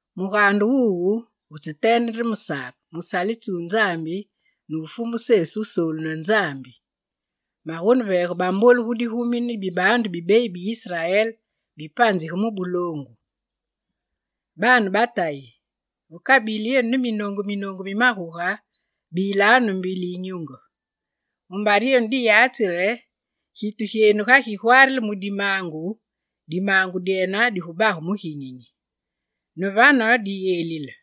Mugaande wuwu, wutseteende nde me Sake, musalitsi wu Nzambi ne wu Fumu Sesu Wusoolu ne Nzambi. Magoneveege bambolu gu digumi ne bibaandu bi beyi bi Israel bipanzige mu buloongu. Baane ba Tayi, ve kabili yenu ne minoongu minoongu mi maguge, bilanu ne mbili yinyunge; mumbare yenu diyatsi re, gitu gyeenu ga gigwaarile mu dimaangu, dimaangu dyene digubage muginyinyi. Ne vane, diyelile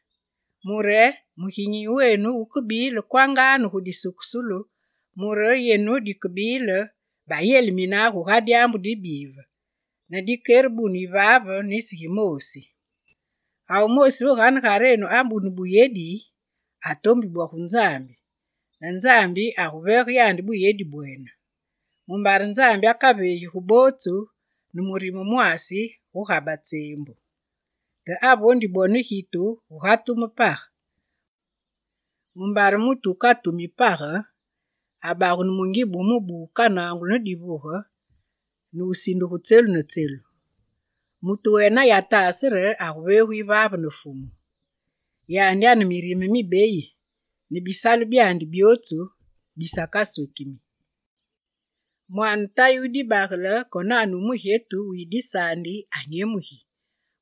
mure muginyinyi wenu wukebile kwanga ne gu disukusulu, mure yenu dikebile bayelimine guga dyaambu dibive, ne dikerebunu yivaave nisi gimoosi. Ga wumoosi ve ganegarenu abunu buyedi, atombi bwo gu Nzambi, ne Nzambi aguveege yandi buyedi bwene; mumbare Nzambi akaveegi gu bootsu ne murime mwaasi guga batseembu. Te avondi bwo ne gitu, guga tume page; mumbare mutu wukatumi page abagunu mungibe wu mubu wukanangulu ne divuge ne wusindigu tselu ne tselu. Mutu wene ayataase re aguveegu yivaave ne Fumu. Yandi ane mirime mibeyi ne bisalu byandi byootsu bisakaswekimi. Mwaane tayi wu dibagele konane wu mugyetu wuyi disaandi anyemugi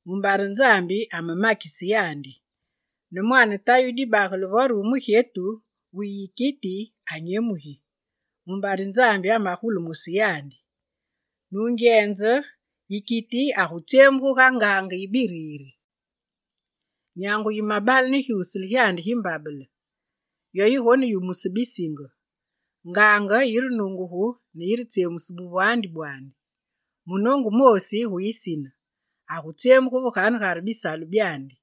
mumbare Nzambi amemakise yandi, ne mwaane tayi wu dibagele vore wu mugyetu wuyi yikiti anyemugi mumbare Nzambi amegulumuse yandi: nungyenze, yikiti agutsyemugu ga ngaange yi biriri. Nyangu yimebale ne gyusule gyandi gi mbabele, yo yigoneyumuse bisinge; ngaange yirenungugu ne yiretsyemuse buvwaandi bwandi. Munoongu wumoosi gu yisine, agutsyemugu ve ganegare bisalu byandi.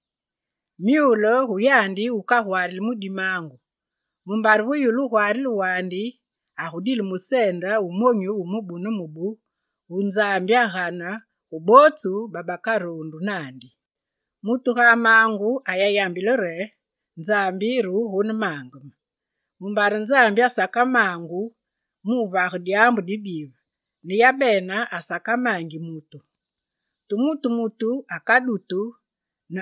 Myule gu yandi wukagwaarili mu dimaangu; mumbare ve yulu wugwaarile wandi, agudile museende wu monyu wu mubu ne mubu wugane Nzambi gu bootsu babakaroondu naandi. Mutu ga amaangu ayayambile re: «Nzambi re wugonemaange me», mumbare Nzambi asakamaangu mu wuvage dyaambu dibive ne yabene asakamaangi mutu. Te mutu mutu akadutu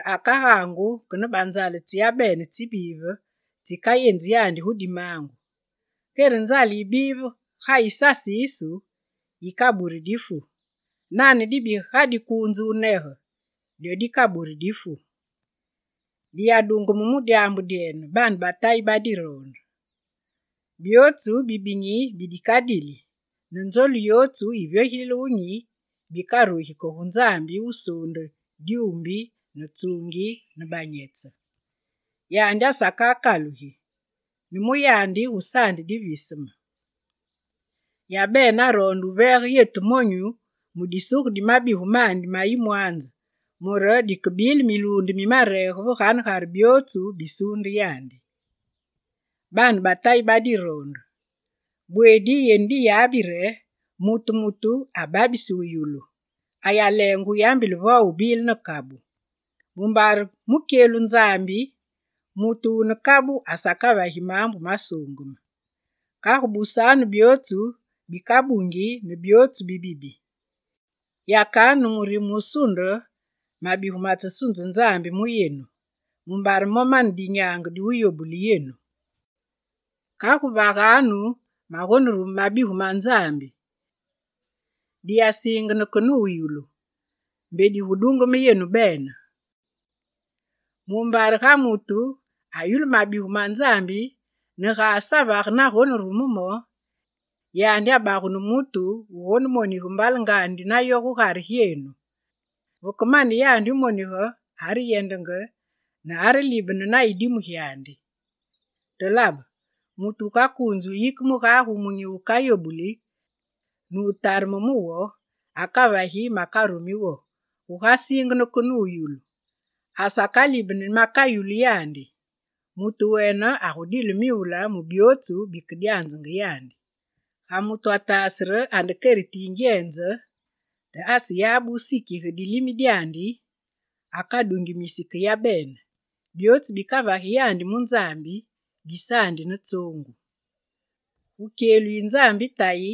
akagaangu ke ne banzaale tsi yabene tsibive tsikayenzi yandi gu dimaangu. Kere nzaale yiyibi ga yisasiisu yikaburi dibi. Nane dibi ga dikuunze wunege, dyo dikaburi difu. Diyadungeme mu dyaambu dyene, baane ba Tayi badiroonde: byootsu bibinyi bidikadili, ne nzolu yootsu yivyogilile wunyi bikarugi ke gu Nzambi wusuunde dyuumbi ne tsuungi, ne banyetse. Yandi asakakalugi, ne mu yandi gusaandi diviseme. Yabene aroonde wuveege yetu monyu mu disuge di mabigu mandi ma yimwaanze mure dikebile miluunde mi mareege ve ganegare byootsu bisuunde yandi. Baane ba Tayi ba diroonde, bweedi yenu diyabi re: mutu mutu ababisi wuyulu, ayaleenge wuyambile vo wubile ne kabu. Mumbare mu kyelu Nzambi, mutu wune kabu asakavagi maambu masuungeme. Kagu busanu byootsu bikabungi ne byootsu bibibi. Yakanu ne murime wusunde, mabigu matsesunze Nzambi mu yenu, mumbare mo mane dinyaange diwuyobule yenu. Kagu vaganu magonerume mabigu ma Nzambi, diyasiingene ke ne wuyulu mbe digudungeme yenu bene. Mumbare ga mutu ayulu mabigu ma Nzambi ne ga asavage navegonerume mo, yandi abagunu mutu wugonemonige mbalengandi nayo gugare gyeenu. Veke mane yandi wumonige, areyendenge ne arelibene na yidimu gyandi. Te labe mutu wukakuunzi wuyike mugage wumunyi wukayobuli ne wutareme mu wo. Akavagi makarumi wo, guga siingene ke ne wuyulu, asakalibeni makayulu yandi. Mutu wene agudile myule mu byootsu bikedyanzenge yandi. Ga mutu ataase re ande keriti yi ngyenze, te aseyabe wusikige dilimi dyandi, akadungimisi ke yabene, byootsu bikavagi yandi mu Nzambi bisaandi ne tsoongu. Gu kyelu yi Nzambi Tayi,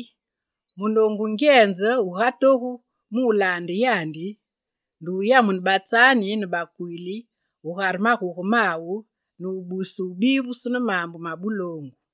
munoongu wungyenze wugatogu mu wulaande yandi nde wuyamune batsaani ne bakwiili gugare maguge mawu ne wubuse wubivusu ne maambu ma buloongu.